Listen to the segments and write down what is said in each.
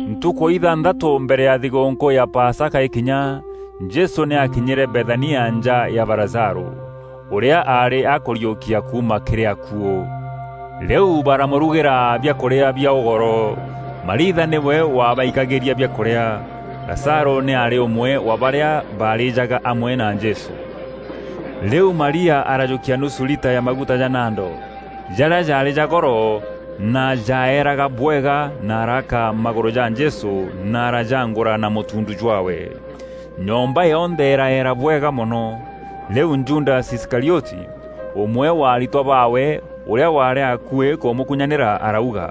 Ntukû ithanthatû mbere ya thigûûnkû ya Pasaka îkinya, Jesû nî aakinyîre Bethania nja ya ba Lazarû, ûrîa aarî akûriûkia kuuma kîrî akuû. Rîu baramûrugîra biakûrîa bia ûgoro. Mariitha nîwe waabaikagîria biakûrîa. Lazarû nî aarî ûmwe wa barîa baarîîjaga amwe na Jesû. Rîu Maria arajûkia nusu lita ya maguta ja nado, jarîa jaarî ja goro, na jaaeeraga bwega, na araaka magûrû ja Jesû na arajaangûra na mûtuundu jwaawe. Nyomba yonthe îraeera bwega mono. Rîu Judasi Iskarioti, ûmwe wa aritwa baawe, ûrîa waarî akuî kûmûkunyanîra arauga,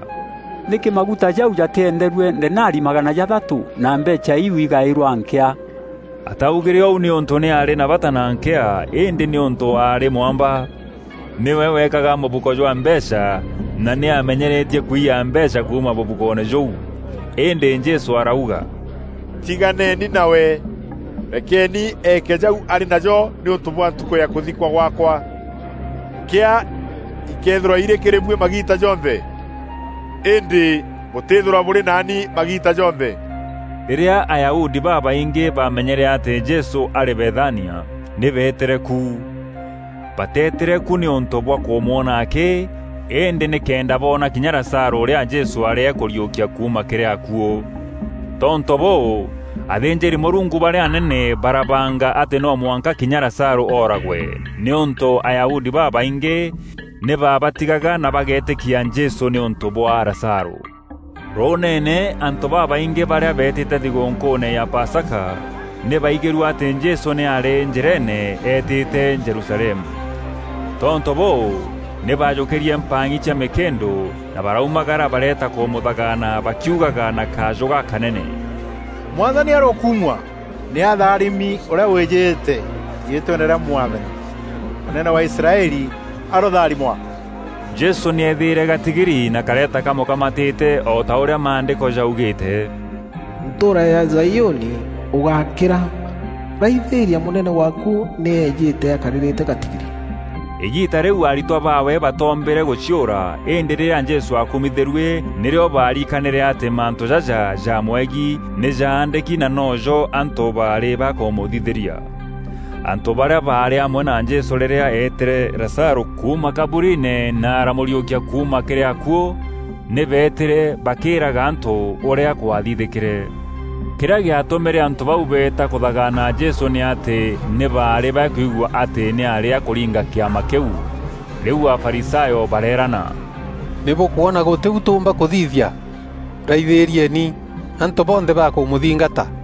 “Nîkî maguta jau jatîenderue denari magana jathatû na mbeecha iu igaîrwa nkîa?” Ataugîre ûu nîûntû nî aarî na bata na nkîa, îndî nîûntû aarî mwamba. Nîwe weekaga mûbuko jwa mbeecha na nî amenyeretie kwiya mbeecha kuuma mûbukoone jûu. Îndî Jesû arauga, “Tiganeni nawe! Rekeeni eeke jau arî najo nîûntû bwa ntukû ya kûthikwa gwaakwa. Nkîa ikeethîrwa irî kîrî buî magiita jonthe, îndî bûtîthîrwa bûrî naani magiita jonthe.” Rîrîa Ayahudi babaingî bamenyere atî Jesû arî Bethania, nî beetîre ku. Batetîre ku nîûntû bwa kûmwona akî, îndî nîkenda boona kinya Lazarû ûrîa Jesû aarî akûriûkia kuuma kîrî akuû. Tontû bûû, athînjîri-Mûrungu barîa anene barabanga atî no mwanka kinya Lazarû ooragwe, nîûntû Ayahudi babaingî nî baabatigaga na bageetîkia Jesû nîûntû bwa Lazarû. Rûûneene, antû babaingî barîa beetîte thigûnkûûne ya Pasaka, nî baigîrue atî Jesû nî aarî njîreene eetîte Jerusalemu. Tontû bûû, nî baajûkîrie mpang'i cia mîkîndû na baraumagara bareeta kûmûthagaana bakiugaga na kajû gakanene, “Mwathani arokumua! Nî atharimi ûrîa wîjîte riîtweene rîa Mwathani. Mûnene wa Israeli arotharimwa.” Jesû nî eethîîre gatigiri na kareeta kamûkamatîte o ta ûrîa Maandîko jaugîîte: “Ntûûra ya Zaiûni, ûgákîra! Raithîîria, mûnene waaku nî eejîte, akarîrîte gatigiri.” Îgiita rîu aritwa baawe batoombîre gûciûra, îndî rîrîa Jesû aakumithîrue, nîrîo baariikanîre atî mantû jaja jamwegiî nî jaandîki na noo jo antû baarî bakûmûthithîria. Antû barîa baarî amwe na Jesû rîrîa eetîre Lazarû kuuma kaburiine na aramûriûkia kuuma kîrî akuû, nî beetîre bakîîraga antû ûrîa kwathithîkîre. Kîrîa gîatûmîre antû bau beeta kûthagaana Jesû nî atî nî baarî bakuigua atî nî aarî akûringa kîama kîu. Rîu Afarisayo bareerana, “Nî bûkwona gûtî u tûûmba kûthithia! Raithîrieni, antû bonthe bakûmûthingata.”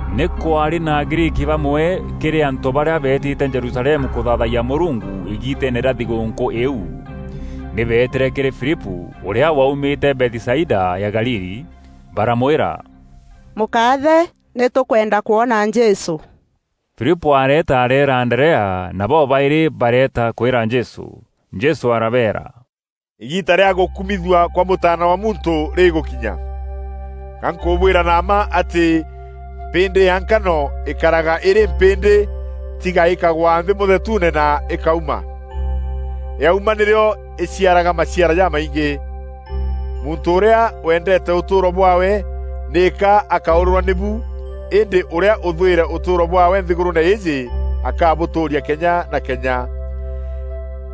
Nî kwaarî na Agriiki bamwe kîrî antû barîa beetîte Jerusalemu kûthaathayia Mûrungu îgiiteene rîa thigûûnkû îîu. Nî beetîre kîrî Filipû, ûrîa waumîte Bethisaida ya Galili, baramwîra, “Mûkaathe, nî tûkwenda kwona Jesû.” Filipû areeta areera Anderea, na bobaîrî bareeta kwîra Jesû. Jesû arabeera, “Îgiita rîa gûkumithua kwa Mûtaana wa Muntû rîgûkinya. Ga nkûbwîra na mma atî mpîndî ya nkano îkaraga îrî mpîndî tiga îkagwa nthî mûthetuune na îkauma. Yaumaa nîrîo îciaraga maciara jamaingî. Muntû ûrîa wendeete ûtûûro bwaawe, nîka akaûrîrwa nîbu îndî ûrîa ûthwîre ûtûûro bwaawe nthîgûrûûne îîjî akabûtûûria kenya na kenya.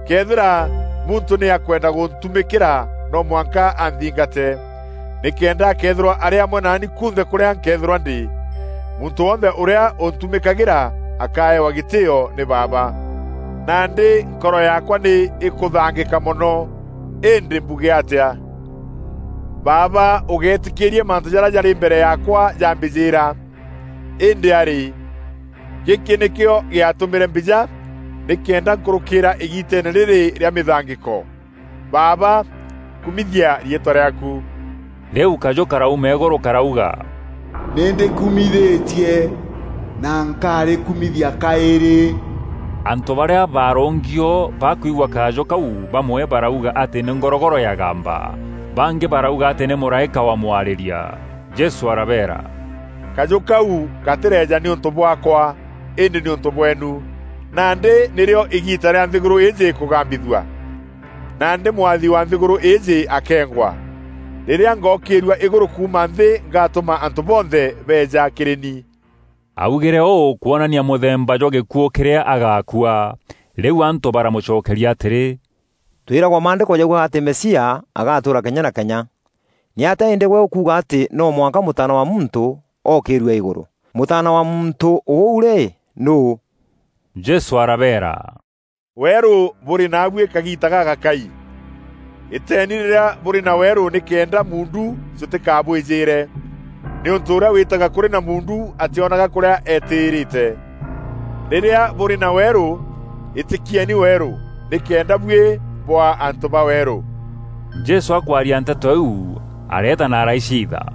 Këethîra muntû nî akwenda gûntumîkîra noo mwanka anthingate, nîkenda akeethîrwa arî amwe naani kunthe kûrîa nkeethîrwa ndî. Muntû wonthe ûrîa ûntumîkagîra akaaewa gîtîîo nî Baaba. “Nandî nkoro yaakwa nî îkûthangîka mono. Îndî mbuge atîa? Baaba ûgéetîkîîria mantû jarîa jarî mbere yaakwa jambîjîîra. Îndî arî, gîkî nîkîo gîatûmîre mbîja, nîkenda nkûrûkîîra igiitene rîrî rîa mîthangîko. Baaba, kumithia riîtwa rîaaku.” Rîu kajû karauma îgûrû karauga, “Nî ndîkumithîtie na nkarîkumithia kaîrî.” Antû barîa baarûngi o bakwiigua kajû kau, bamwe barauga atî nî ngorogoro yagamba, bangî barauga atî nî mûraîka wa mwarîria. Jesû arabeera, “Kajû kau gatîreeja nîûntû bwaakwa, îndî nîûntû bweenu. Nandî nîrîo îgiita rîa nthîgûrû îîjî kûgambithua; nandî mwathi wa nthîgûrû îîjî akeengwa. Rîrîa ngokîîrua îgûrû kuuma nthî ngatûma antû bonthe beeja kîrî ni.” Augîre ûû kwonanania mûthemba jwa gîkuû kîrîa agaakua. Rîu antû baramûcokeria atîrî, “Twîragwa maandîko jaugaga atî Mesia agatûûra kenya na kenya. Nîatîa îndî gwe ûkuuga atî no mwanka Mûtaana wa Muntû ookîrue îgûrû? Mûtaana wa Muntû ûu rî, nûû?” Jesû arabeera, “Weerû bûrî naabuî kagiita gagakai. Îteeni rîrîa bûrî na weerû nîkenda muundu jûtîkabwîjîîre; nîûntû ûrîa wîtaga kûrî na muundu atîonaga kûrîa eetîrîte. Rîrîa bûrî na weerû, îtîkieni weerû, nîkenda buî bûaa antû ba weerû.” Jesû akwaria nteto iu, areeta na araiciitha.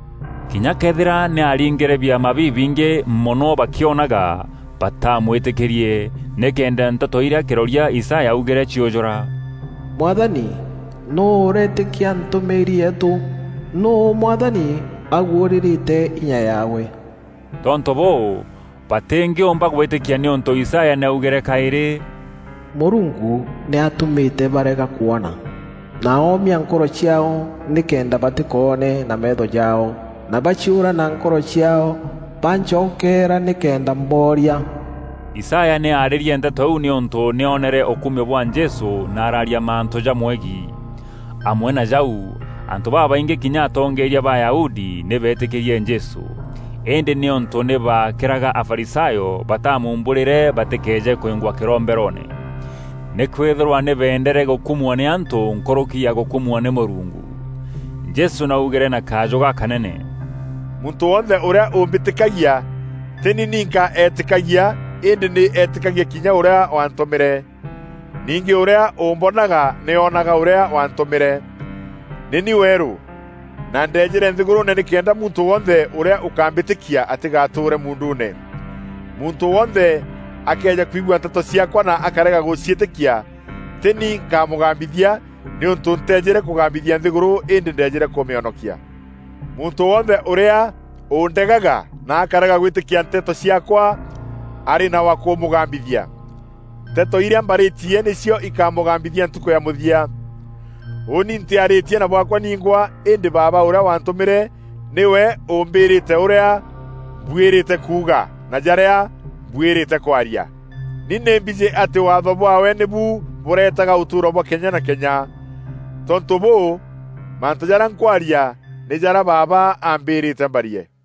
Kinya këethîra nî aaringîre biama bibingî mono bakîonaga, baatamwîtîkîrie, nîkenda nteto irîa kîroria Isaya augîre ciûjûra: “Mwathani, nûû ûreetîkia ntûmîîri yeetû? Nûû Mwathani aguûrîrîte inya yaawe?” Tontû bûû, batîngîûmba gwîtîkia nîûntû Isaya nî aaugîre kaîrî, “Mûrungu nî atûmîte baarega kûona, na oomia nkoro ciaao; nîkenda batîkoone na meetho jaao, na baciûra na nkoro ciaao; bancokeera nîkenda mbooria.” Isaya nî aarîrie nteto iu nîûntû nî oonere ûkumio bwa Jesû na araaria mantû jamwegiî. Amwe na jau, antû babaingî kinya atongeeria ba Ayahudi nî beetîkîrie Jesû. Îndî nîûntû nî baakîraga Afarisayo bataamuumbûrîre batîkeeje kwîngwa kîromberoone. Nîkwîthîrwa nî beendere gûkumua nî antû nkûrûki ya gûkumua nî Mûrungu. Jesû nî augîre na kajû gakanene, “Muntû wonthe ûrîa ûmbîtîkagia tî ni ninka eetîkagia îndî nî eetîkagia kinya ûrîa waantûmîre. Ningî ûrîa ûmbonaga nî oonaga ûrîa waantûmîre. Nî ni weerû, na ndeejîre nthîgûrûûne nîkenda muntû wonthe ûrîa ûkambîtîkia atîgatuure muunduune. Muntû wonthe akëeja kwigua nteto ciaakwa na akarega gûciîtîkia, tî ni nkamûgambithia nîûntû nteejîre kûgambithia nthîgûrû îndî ndeejîre kûmîonokia. Muntû wonthe ûrîa ûndegaga na akarega gwîtîkia nteto ciaakwa arî na wa kûmûgambithia. Nteto îrîa mbarîîtie nîcio îkamûgambithia ntukû ya mûthia. Ûûni ntîarîtie na bwaakwa ningwa îndî Baaba ûrîa waantûmîre nîwe ûmbîrîte ûrîa mbwîrîte kuuga, na jarîa mbwîrîte kwaria. Ni nî mbijî atî Waatho bwaawe nîbu bûreetaga ûtûûro bwa kenya na kenya. Tontû bûû, mantû jarîa nkwaria, nî jarîa Baaba ambîrîte mbarie.”